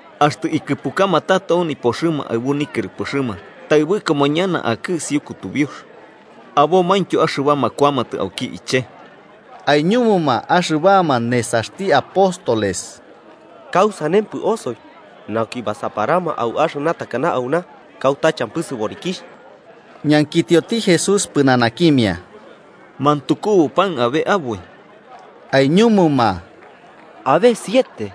Axtɨ ikɨpukama tato au nipoxɨma aɨbu nikɨrɨpɨxɨma, taɨbɨkoma ñana akɨ isiu kutubiux, abomaintyo axɨbama kuamatɨ auki iche. Aiñumuma axɨbama nesaxti apóstoles: –¿Kausanempɨ osoi nauki basaparama au axɨna takana auna, kauta champɨ sɨborikixh? Ñankitioti Jesús pɨnanakimia: –¿Mantukubu pan abe aboi? –Aiñumuma–abe siete.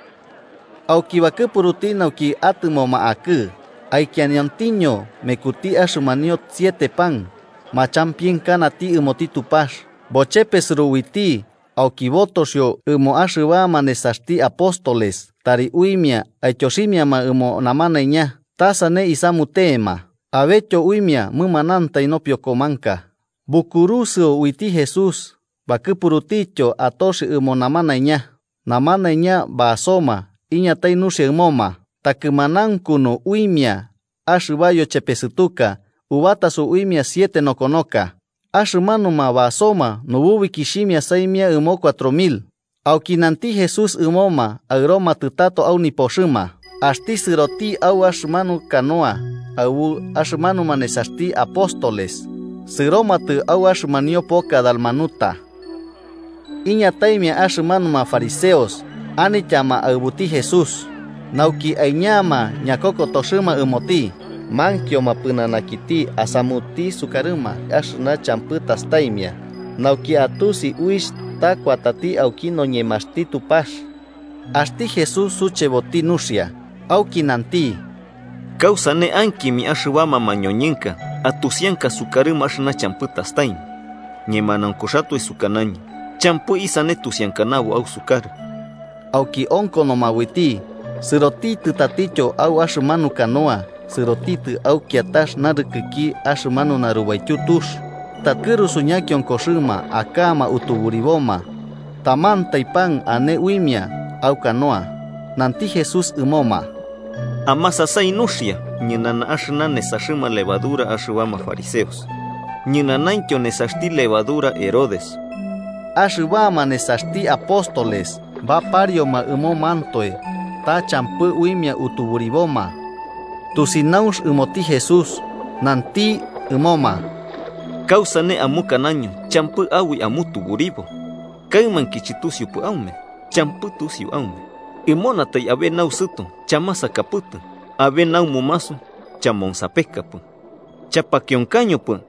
Auki bakɨpuruti nauki atɨmoma akɨ, aikianiontiño mekuti axɨmanio siete pan, machampienkanati ɨmoti Tupax, bochepesɨro uiti auki botoxio ɨmoma axɨbama nesaxti apóstoles tari uimia aityoximiama ɨmo namanaiña, ta sane isamutema. Abetyo uimia mɨmanantai nopiokomanka. Bukurusɨo uiti Jesús, bakɨpurutityo autoxi ɨmo namanaiña. Namanaiña basoma iñatai nuxia ɨmoma, takɨmanaunkunu uimia axɨba niyochepesɨtuka ubataso uimia siete nokonoka. Axɨmanuma basoma nububikixhimia saimia ɨmo cuatro mil. Auki nanti Jesús ɨmoma aɨromatɨ tato au nipoxɨma, axti sɨroti au axɨmanu canoa aɨbu axɨmanuma nesaxti apóstoles sɨromatɨ au axɨmanio poka Dalmanuta. Iñataimia axɨmanuma fariseos anityama aɨbuti Jesús. Nauki aiñama ñakokotoxɨma ɨmoti, mankioma pɨnanakiti asamuti sukarɨma axɨna champɨ tastaimia, nauki atusi uixh ta kuatati auki noñemaxti Tupax. Axti Jesús sucheboti nuxia, auki nanti: –¿Kausane ankimia axɨbama mañoñɨnka atusianka sukarɨma axɨna champɨ tastaimia? Ñemanaunkuxatoe sukanañɨ champɨ isane tusiankanabo ausukarɨ. Auki onkonoma uiti, sɨrotitɨ tatityo au axɨmanu canoa sɨrotitɨ au kiatax narɨkɨki axɨmanu narubaityu tux. Takɨrusu ñakionkoxɨma aka'ama utuburiboma, tamantai pan ane uimia au canoa. Nanti Jesús ɨmoma: –Amasasai nuxia ñɨnana axɨna nesaxɨma levadura axɨbama fariseos, ñɨnanaintyo nesaxti levadura Herodes. Axɨbama nesaxti apóstoles baparioma ɨmomantoe ta champɨ uimia utuburiboma. Tusinaunx ɨmoti Jesús, nanti ɨmoma: –¿Kausane amukanaño champɨ aboi amutuburibo? ¿Kaɨmainki chɨtusiupɨ aume? ¿Champɨ tusiu aume? ¿Munatai abe nausɨto chamasakapɨtɨ, abe naumumasu chamonsapekapɨ? ¿Chapakionkañopɨ?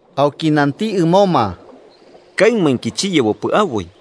Auki nanti ɨmoma: –¿Kaɨmainki chiyebopɨ aboi?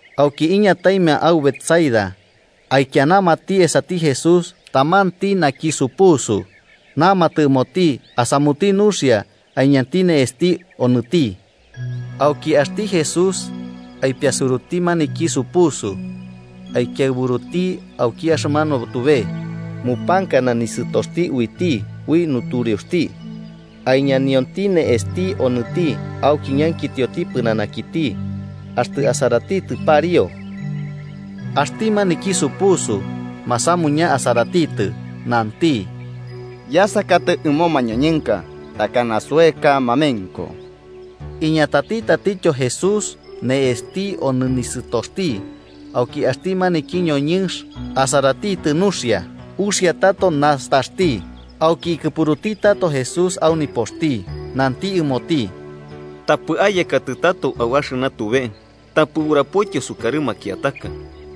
Auki iñataimia au Betsaida, aikianamati esati Jesús tamanti naki supusu, namatɨ ɨmoti asamuti nuxia aiñanti ne'esti onɨti. Auki axti Jesús aipiasuruti maniki supusu aikiaɨburutiti auki axɨmanu tube. Mupankana nisɨtoxti uiti ui nutureuxti, aiñanionti ne'esti onɨti auki ñankitioti pɨnanakiti axtɨ asaratitɨ pariu. Axti maniki supusu masamuña asaratitɨ, nanti: –Yasakatɨ ɨmo mañoñɨnka. Takana soeka mamenko. Iñatati tatityo Jesús ne'esti omonɨ nisɨtoxti, auki axti maniki ñoñɨnx asaratitɨ nuxia uxia tato nastaxti. Auki ikɨpuruti tato Jesús au nipoxti, nanti ɨmoti: –Tapɨ ayekatɨ tato au axɨna tube. Tapɨ urapoityo sukarɨ makiataka.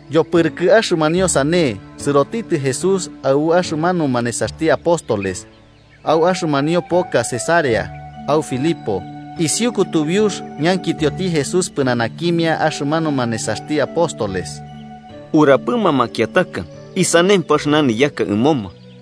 Yopɨrɨkɨ axɨmanio sane, sɨrotitɨ Jesús aɨbu axɨmanuma nesaxti apóstoles au axɨmanio poka Cesarea au Filipo. Isiu kutubiux, ñankitioti Jesús pɨnanakimia axɨmanuma nesaxti apóstoles: –¿Urapɨma makiataka isanempɨ axɨna niyaka ɨmoma?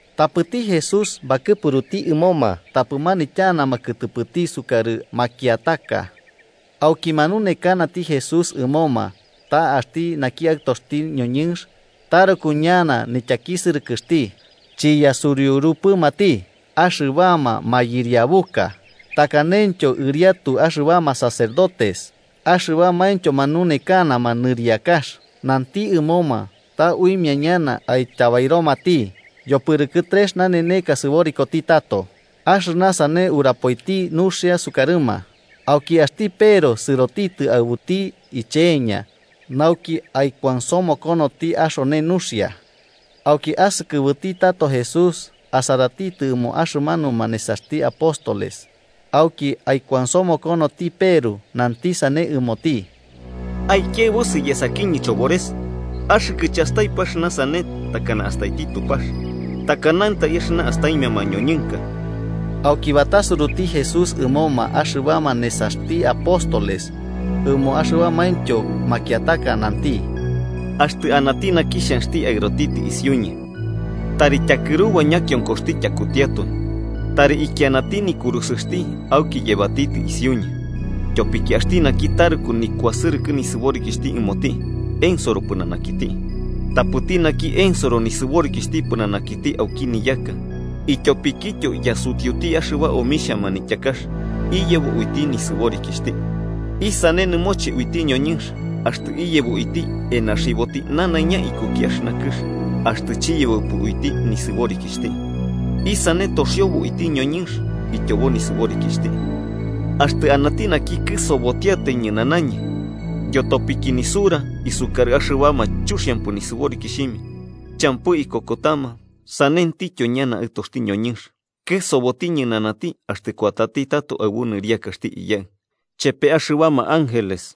Tapɨti Jesús bakɨpuruti ɨmoma tapɨ manityanama kɨtɨpɨti sukarɨ makiataka. Auki manunekanati Jesús ɨmoma ta axti naki Aɨtoxti noñɨnx taruku ñana nityakisɨrɨkɨxti, chiyasuriurupɨmati axɨbama mayɨriabuka, takanentyo ɨriatu axɨbama sacerdotes axɨbamaintyo manunekanama niriakax. Nanti ɨmoma ta uimia ñana aityabairomati, yopɨrɨkɨ trex naneneka sɨborikoti tato. Axɨna sane urapoiti nuxia sukarɨma. Auki axti Peru sɨrotitɨ aɨbuti iche'eña nauki aikuansomokonoti axone nuxia. Auki asɨkɨbɨti tato Jesús, asaratitɨ ɨmo axɨmanuma nesaxti apóstoles auki aikuansomokonoti Peru, nanti sane ɨmoti: –¡Aikiaɨbusɨ yesakiñɨ, Chobores! Axɨkɨ chastaipɨ axɨna sane takana astaiti Tupax, takanantai axɨna astaimia mañoñɨnka. Auki batasuruti Jesús ɨmoma axɨbama nesaxti apóstoles, ɨmo axɨbamaintyo makiataka, nanti: –Axtɨ anati naki xhanxti aɨrotitɨ isiuñɨ, tari tyakɨruba ñakionkoxti tyakutiatoi, tari ikianati nikurusɨxti auki yebatitɨ isiuñɨ. Tyopiki axti naki taruku nikuasɨrɨkɨ nisɨborikixhti ɨmoti, ensoro Pɨnanakiti. Tapɨti naki ensoro nisɨborikixhti pɨnanakiti auki niyaka ityopikityo yasutiuti axɨba omixhia manityakax, iyebo uiti nisɨborikixhti. ¿Isane nɨmoche uiti ñoñɨnx axtɨ iyebo uiti enaxiboti nanaiña ikuki axɨna kɨx, axtɨ chiyebopɨ uiti nisɨborikixhti? ¿Isane toxiobo uiti ñoñɨnx ityobo nisɨborikixhti? Axtɨ anati naki kɨsobotiatai ñɨnanañɨ yotopiki nisura isukarɨ axɨbama chuxiampɨ nisɨborikixhimia, champɨ ikokotama, sanentityo ñana Aɨtoxti noñɨnx kɨsoboti ñɨnanati axtɨ kuatati tato aɨbu nɨriakaxti Iyaɨ ichepe axɨbama ángeles.